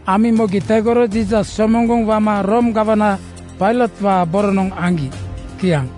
Amiŋ mogi tegoro Jiisas somoŋgoŋ wama Room gawana Pailotwaa boronoŋ aŋgi. Kiaŋ.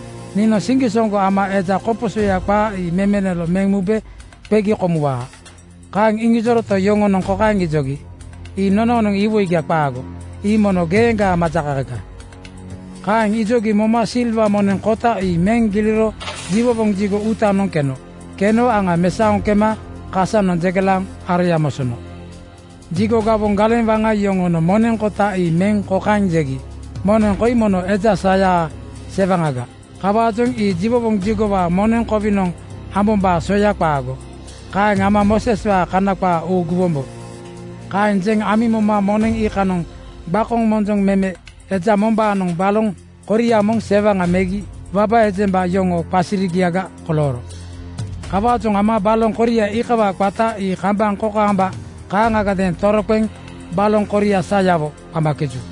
“Niinoŋ siŋgisoŋgo ama eja koposoya qaa ii memelolo meŋ mube qegi komuwaa.” Kaeŋ iŋijoroto, yoŋonoŋ kokaeŋ ijogi, “Ii nonoonoŋ iwoiga qaago! Ii mono geeŋgaa majakakaga!” Kaeŋ ijogi moma silwa moneŋ kota ii meŋ giliro jiwowoŋ jigo uutanoŋ keno. Keno aŋa mesaoŋ kema kasanoŋ jegelaaŋ aroya mosono. Jigo gawoŋ galeŋ waŋa yoŋonoŋ moneŋ kota ii meŋ kokaeŋ jegi, “Moneŋ koi mono eja sayaa sewaŋaga. Kawaajoŋ ii jiwowoŋ jigowaa moneŋ kowinoŋ ambombaa soya qaago. Kaeŋ ama Mooseswaa Kana qaa uuguwombo.” Kaeŋ jeŋ amiŋ moma moneŋ iikanoŋ gbakonoŋ monjoŋ meme eja mombaanoŋ baloŋ koria moŋ sewaŋa megi waba ejemba yoŋoo qasirigiaga kolooro. Kawaajoŋ ama baloŋ koria iikawaa qata ii kambaŋ kokaamba kaaŋagadeeŋ toroqeŋ ‘Baloŋ koria sayawo,’ qamakeju.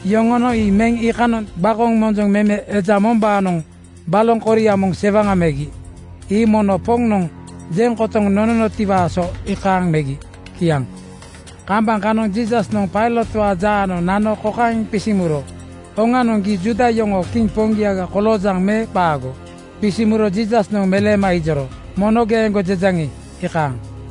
Yoŋonoŋ ii meŋ iikanoŋ gbakonoŋ monjoŋ meme eja mombaanoŋ baloŋ koria moŋ sewaŋa megi. Ii mono Poŋnoŋ jeŋ kotoŋ nonotiwaa so iikaaŋ megi.” Kiaŋ. Kambaŋ kanoŋ Jiisasnoŋ Pailotwaa jaanoŋ nano kokaeŋ qisiŋ muro, “Oŋanoŋ, gii Juuda yoŋoo kiŋ poŋgia koloojaŋ me qaago?” Qisiŋ muro Jiisasnoŋ meleema ijoro, “Mono geeŋgo jejaŋi, iikaaŋ.”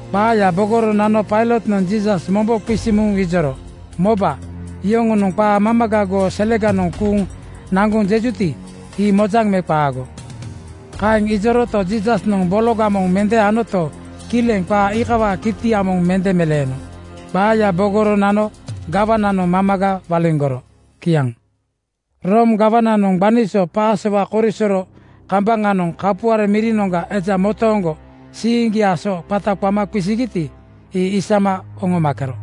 Qaaya bogoro nano Pailotnoŋ Jiisas mombo qisiŋ muŋ ijoro, “Moba! Yoŋonoŋ qaa mamaga goo seleganoŋ kuuŋ naŋgoŋ jejuti, ii mojaŋ me qaago?” Kaeŋ ijoroto, Jiisasnoŋ bologa moŋ mende anoto, kileŋ qaa iikawaa kitia moŋ mende meleeno. Qaaya bogoro nano gawananoŋ mamaga waliŋgoro. Kiaŋ. Room gawananoŋ gbani so Pasowa korisoro kambaŋanoŋ kapuare mirinoŋga eja motooŋgo siiŋgiaa so qata qama qisigiti, ii isama oŋomakero.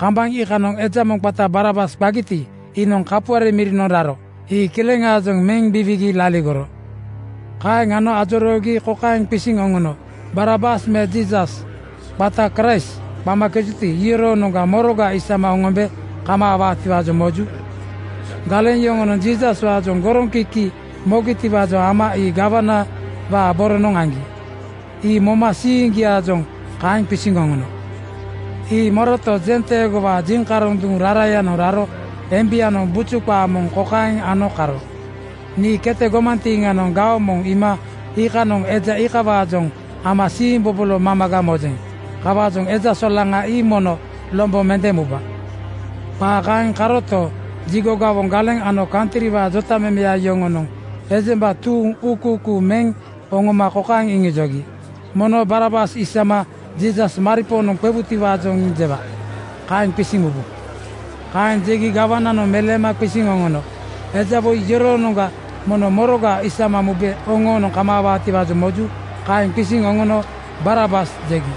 Kambaŋ iikanoŋ eja moŋ qata Barabas qagiti, iinoŋ kapuare mirinoŋ raro. Ii kileŋaajoŋ meŋ biwiigi laligoro. Kaeŋ ano ajoroogi kokaeŋ qisiŋ oŋono, “Barabas me Jiisas, qata Kraist qamakejuti, iyoroonoŋga moroga isama oŋombe kamaawaatiwaajoŋ moju?” Galeŋ yoŋonoŋ Jiisaswaajoŋ goroŋkiki mogitiwaajoŋ ama ii gawanawaa boronoŋ aŋgi. Ii moma siiŋgiaajoŋ kaeŋ qisiŋ oŋono. Ii moroto, jenteegowaa jiŋkaroŋ duŋ rarayanoŋ raro embianoŋ buju qaa moŋ kokaeŋ ano karo, “Nii kete gomantiiŋanoŋ gaoŋ moŋ iima iikanoŋ eja iikawaajoŋ ama siimbobolo mamaga mojeŋ. Kawaajoŋ eja solaŋa ii mono lombo mende muba.” Qaa kaeŋ karoto, jigo gawoŋ galeŋ ano kantriwaa jotamemeya yoŋonoŋ ejemba tuuŋ uukuukuu meŋ oŋoma kokaeŋ iŋijogi, “Mono Barabas isama Jiisas maripoonoŋ qewutiwaajoŋ jewa. Kaeŋ qisiŋ mubu.” Kaeŋ jegi gawananoŋ meleema qisiŋ oŋono, “Eja woi yoroonoŋga mono moroga isama mube oŋoonoŋ kamaawaatiwaajoŋ moju?” Kaeŋ qisiŋ oŋono “Barabas!” jegi.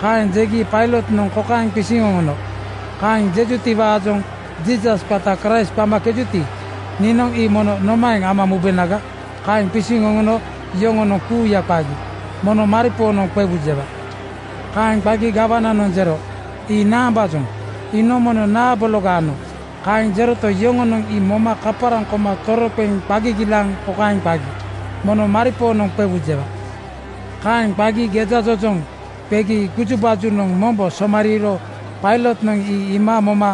Kaeŋ jegi Pailotnoŋ kokaeŋ qisiŋ oŋono, “Kaeŋ jejutiwaajoŋ Jiisas, qata Kraist qamakejuti, niinoŋ ii mono nomaeŋ ama mubenaga?” Kaeŋ qisiŋ oŋono yoŋonoŋ kuuya qagi, “Mono maripoonoŋ qewu jewa!” Kaeŋ qagi gawananoŋ jero, “Ii naambaajoŋ? Iinoŋ mono naa bologa ano?” Kaeŋ jeroto, yoŋonoŋ ii moma kaparaŋ koma toroqeŋ qa gigilaaŋ kokaeŋ qagi, “Mono maripoonoŋ qewu jewa!” Kaeŋ qagi gejajojoŋ qegi gujubajunoŋ mombo somariiro Pailotnoŋ ii iima moma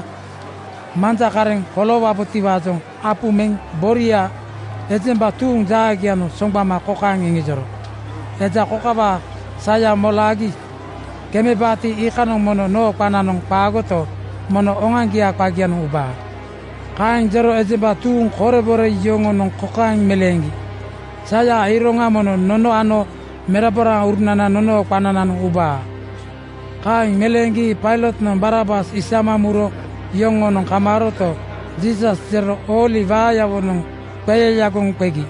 manja kareŋ koloowabotiwaajoŋ apu meŋ boria ejemba tuuŋ jaagianoŋ soŋgbama kokaeŋ iŋijoro, “Eja kokawaa saya molaagi kemebaati, iikanoŋ mono noo qananoŋ qaagoto, mono oŋoaŋgiaa qagianoŋ ubaa.” Kaeŋ jero ejemba tuuŋ korebore yoŋonoŋ kokaeŋ meleeŋgi, “Sayaa iroŋa mono nono ano meraboraurunana nonoo qanananoŋ ubaa!” Kaeŋ meleeŋgi Pailotnoŋ Barabas isama muro yoŋoonoŋ kamaaroto, Jiisasga jero ooli waayawonoŋ qeyayagoŋ qegi.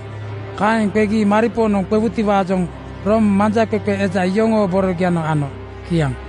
Kaeŋ qegi maripoonoŋ qewutiwaajoŋ Room manjaqeqe eja yoŋoo borogianoŋ ano. Kiaŋ.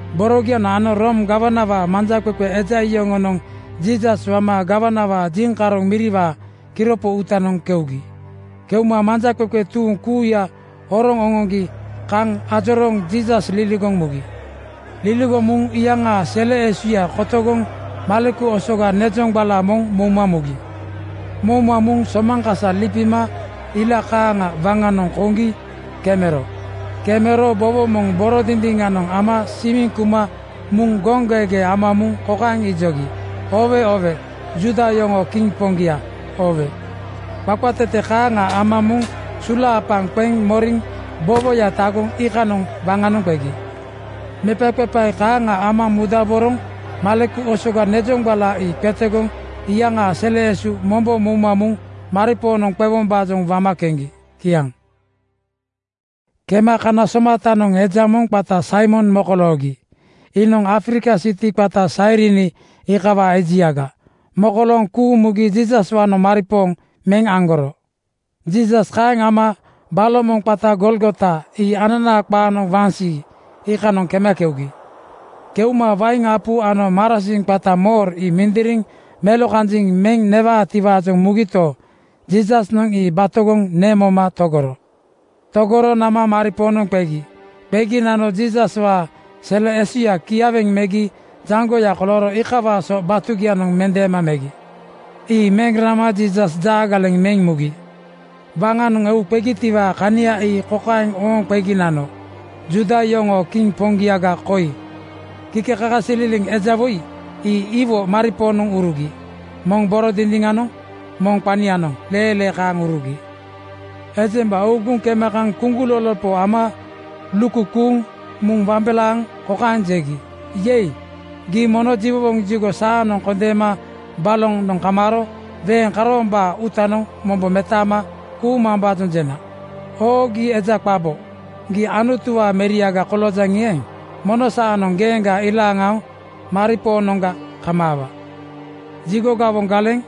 Borogianoŋ ano Room gawanawaa manjaqeqe eja yoŋonoŋ Jiisas wama gawanawaa jiŋkaroŋ miriwaa kiropo uutanoŋ keugi. Keuma manjaqeqe tuuŋ kuuya horoŋ oŋoŋgi kaŋ ajorooŋ Jiisas liligoŋ mugi. Liligoŋ muŋ iyaŋaa sele esuya kotogoŋ maleku osoga nezoŋgbala moŋ mouma mugi. Mouma muŋ somaŋ kasa lipima ila kaaŋa waŋanoŋ koŋgi kemero. Kemero bowo moŋ boro dindiŋanoŋ ama simiŋ kuma muŋ goŋgeegee ama muŋ kokaeŋ ijogi, “Oowe oowe! Juuda yoŋoo kiŋ poŋgia, oowe!” Qaqatete kaaŋa ama sulaapaŋ qeŋ moriŋ bowoya tagoŋ iikanoŋ waŋanoŋ qegi. Mepaqepae kaaŋa ama mudaboroŋ maleku osoga nezoŋgbala ii qetegoŋ iyaŋaa sele esu mombo mouma muŋ maripoonoŋ qewombaajoŋ wama keŋgi. Kiaŋ. Kema kana somatanoŋ eja moŋ qata Saimon mokoloogi. Iinoŋ Afrika siti qata Sairini iikawaa ejiaga. Mokolooŋ kuuŋ mugi Jiisaswaanoŋ maripooŋ meŋ aŋgoro. Jiisas kaeŋ wama baloŋ moŋ qata Golgota ii ananaa qaanoŋ Waŋsii, iikanoŋ kema keugi. Keuma wain apu ano marasiŋ qata mor ii mindiriŋ melokanjiŋ meŋ newaatiwaajoŋ mugito, Jiisasnoŋ ii batogoŋ neŋ moma togoro. Togoro nama maripoonoŋ qegi. Qegi nano Jiisaswaa sele esuyaa kiaweŋ megi jaŋgoya kolooro iikawaa so batugianoŋ mendeema megi. Ii meŋ rama Jiisas jaagaleŋ meŋ mugi. Waŋanoŋ eu qegitiwaa kania ii kokaeŋ ooŋ qegi nano, ‘Juuda yoŋoo kiŋ poŋgiaga koi.’ Kikekakasililiŋ eja woi ii iwo maripoonoŋ urugi. Moŋ boro dindiŋanoŋ, moŋ qanianoŋ leelee kaaŋ urugi. Ejemba uuguŋ kema kaŋ kuŋgulolopo ama lukukuuŋ muŋ wambelaaŋ kokaeŋ jegi, “Yei! Gii mono jiwowoŋ jigo saanoŋ kondeena balonoŋ kamaaro weeŋ karoombaa uutanoŋ mombo metaama kuumambaajoŋ jena. Oo, gii eja qabo! Gii Anutuwaa Meriaga koloojaŋi eeŋ, mono saanoŋ geeŋga ilaaŋ aoŋ maripoonoŋga kamaawa.” Jigo gawoŋ galeŋ,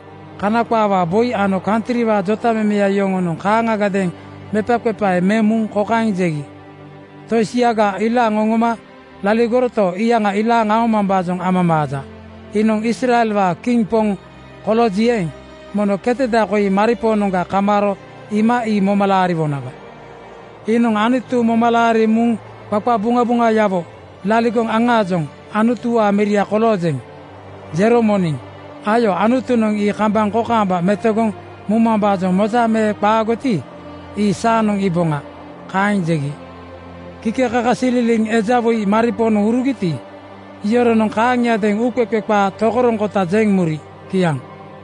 Kana qaawaa boi ano kantriwaa jotamemeya yoŋonoŋ kaaŋagadeeŋ mepaqepae meŋ muŋ kokaeŋ jegi, “Tosiaga ilaaŋ oŋoma laligoroto, iyaŋa ilaaŋ aomambaajoŋ amamaaja. Iinoŋ Israelwaa kiŋ poŋ kolooji eeŋ, mono keteda koi maripoonoŋga kamaaro iima ii moma laariwonaga. Iinoŋ Anutu moma laariŋ muŋ qaqabuŋabuŋayawo laligoŋ aŋaajoŋ ‘Anutuwaa meria koloojeŋ,’ jero moniŋ. Ayo, Anutunoŋ ii kambaŋ kokaamba metogoŋ mumambaajoŋ moja me qaagoti, ii saanoŋ iiboŋa.” Kaeŋ jegi. Kikekakasililiŋ eja iwo maripoonoŋ urugiti, iyoronoŋ kaaŋiadeeŋ uuqeqe qaa tokoroŋkota jeŋ muri. Kiaŋ.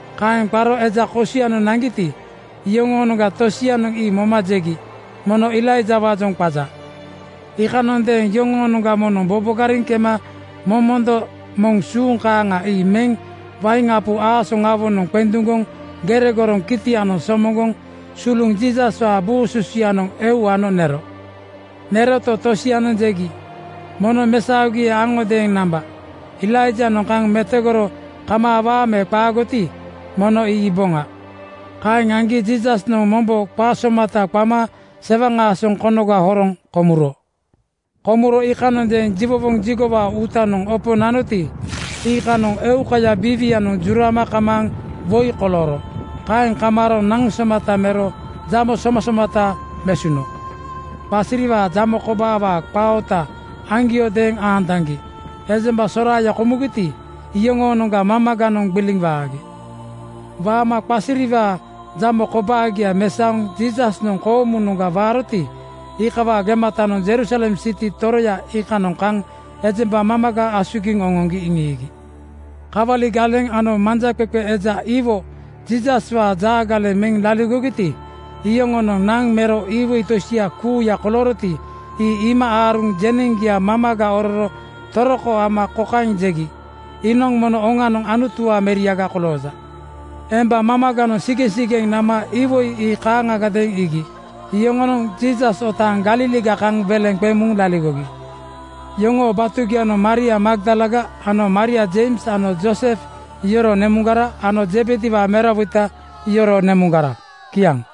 Kaeŋ qaro eja kosianoŋ naŋgiti, iyoŋoonoŋga tosianoŋ ii moma jegi, “Mono Elaijawaajoŋ qaja.” Iikanondeeŋ yoŋoonoŋga moŋnoŋ bobogariŋ kema momondo moŋ suuŋ kaaŋa ii meŋ wain apu aasoŋawonoŋ qenduŋgoŋ gere goroŋ kitianoŋ somoŋgoŋ suluŋ Jiisaswaa buu susuyanoŋ eu ano nero. Neroto, tosianoŋ jegi, “Mono mesaogi aŋodeeŋ namba. Elaijanoŋ kaŋ metogoro kamaawaa me qaagoti, mono ii iiboŋa.” Kaeŋ aŋgi Jiisasnoŋ mombo qa somata qama sewaŋ aasoŋ konoga horoŋ komuro. Komuro iikanondeeŋ jiwowoŋ jigowaa uutanoŋ opo nanoti, iikanoŋ eukaya biiwianoŋ jurama kamaaŋ woi kolooro. Kaeŋ kamaaro naŋ somata mero jamo somasomata mesuno. Qasiriwaa jamo kobaawaa qaa oota aŋgiodeeŋ aantaŋgi ejembaya soraaya komugiti, iyoŋoonoŋga mamaganoŋ gbiliŋ waagi. Waama qasiriwaa jamo kobaagia mesaoŋ Jiisasnoŋ koomunoŋga waaroti, iikawaa gematanoŋ Jerusalem siti toroya iikanoŋ kaŋ ejemba mamaga asugiŋ oŋoŋgi iŋiigi. Kawali galeŋ ano manjaqeqe eja iwo Jiisaswaa jaagaleŋ meŋ laligogiti, iyoŋonoŋ naŋ mero iwoi tosia kuuya kolooroti, ii iima aaruŋ jeneŋgia mamaga ororo toroko ama kokaeŋ jegi, “Iinoŋ mono oŋanoŋ Anutuwaa meriaga kolooja.” Emba mamaganoŋ sigeŋsigeŋ nama iwoi ii kaaŋagadeeŋ iigi. Yoŋonoŋ Jiisas otaaŋ Galiliga kaŋ weleŋ qeŋ muŋ laligogi. Yoŋoo batugianoŋ Maria Magdalaga ano Maria Jeims ano Jooses yoroo nemuŋgara ano Zebediwaa merawoita yoroo nemuŋgara. Kiaŋ.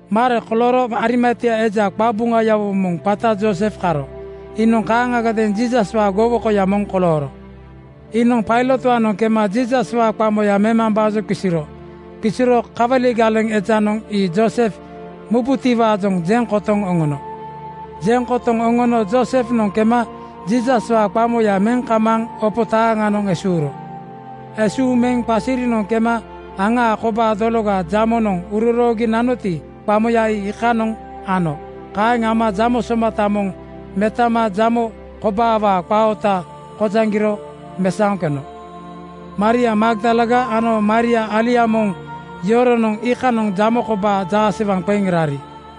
Mare kolooro Arimatia eja qabuŋayawo moŋ qata Joosef karo. Iinoŋ kaaŋagadeeŋ Jiisaswaa gowokoya moŋ kolooro. Iinoŋ Pailotwaanoŋ kema Jiisaswaa qamoya memambaajoŋ qisiro. Qisiro kawali ejanoŋ ii Joosef mubutiwaajoŋ jeŋ kotoŋ oŋono. Jeŋ kotoŋ oŋono Joosefnoŋ kema Jiisaswaa qamoya meŋ kamaaŋ opo taaŋanoŋ esuuro. Esuuŋ meŋ qasirinoŋ kema aŋaa kobaa dologa jamonoŋ uroroogi nanoti, qamoya ii iikanoŋ ano. Kaeŋ ama jamo somata moŋ metano jamo kobaawaa qaa oota kojaŋgiro mesaoŋ keno. Maria Magdalaga ano Maria alia moŋ yoronoŋ iikanoŋ jamo kobaa jaasewaŋ qeŋ rari.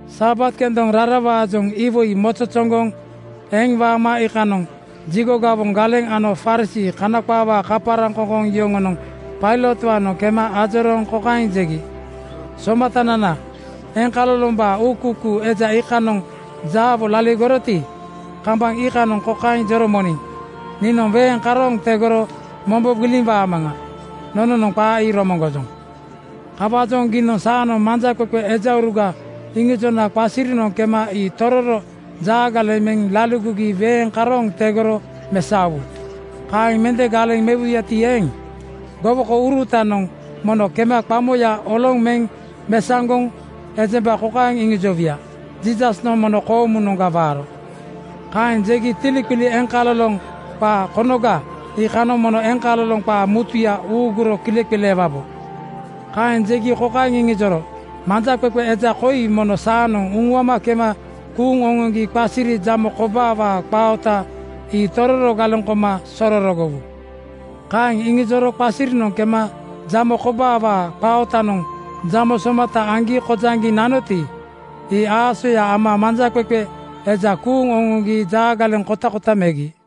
Sabat kendoŋ rarawaajoŋ iwoi mozozoŋgoŋ eŋ waama iikanoŋ jigo gawoŋ galeŋ ano Farisii (Kana qaawaa kaparaŋkoŋkoŋ) yoŋonoŋ Pailotwaanoŋ kema ajorooŋ kokaeŋ jegi, “Somatanana, eŋkalolombaa uukuukuu eja iikanoŋ jaawo laligoroti, kambaŋ iikanoŋ kokaeŋ jero moniŋ, ‘Niinoŋ weeŋ karooŋ tegoro mombo gbiliŋ waamaŋa.’ Nononoŋ qaa ii romoŋgojoŋ. Kawaajoŋ giinoŋ saanoŋ manjaqeqe ejauruga iŋijona qasirinoŋ kema ii tororo jaagaleŋ meŋ laligogi weeŋ karooŋ tegoro mesaowu. Kaeŋ mende galeŋ mewuyati eeŋ, gowokourutanoŋ mono kema qamoya oloŋ meŋ mesaŋgoŋ ejemba kokaeŋ iŋijowuya, ‘Jiisasnoŋ mono koomunoŋga waaro.’ Kaeŋ jegi tiliqili eŋkaloloŋ qaa konoga iikanoŋ mono eŋkaloloŋ qaa mutuya uuguro kileqileewabo.” Kaeŋ jegi kokaeŋ iŋijoro, “Manjaqeqe eja koi mono saanoŋ uŋuama kema kuuŋ oŋoŋgi qasiri jamo kobaawaa qaa oota ii tororo galeŋ koma sororogowu.” Kaeŋ iŋijoro qasirinoŋ kema jamo kobaawaa qaa ootanoŋ jamo somata aŋgi kojaŋgiŋ nanoti, ii aasoya ama manjaqeqe eja kuuŋ oŋoŋgi jaagaleŋ kotakota megi.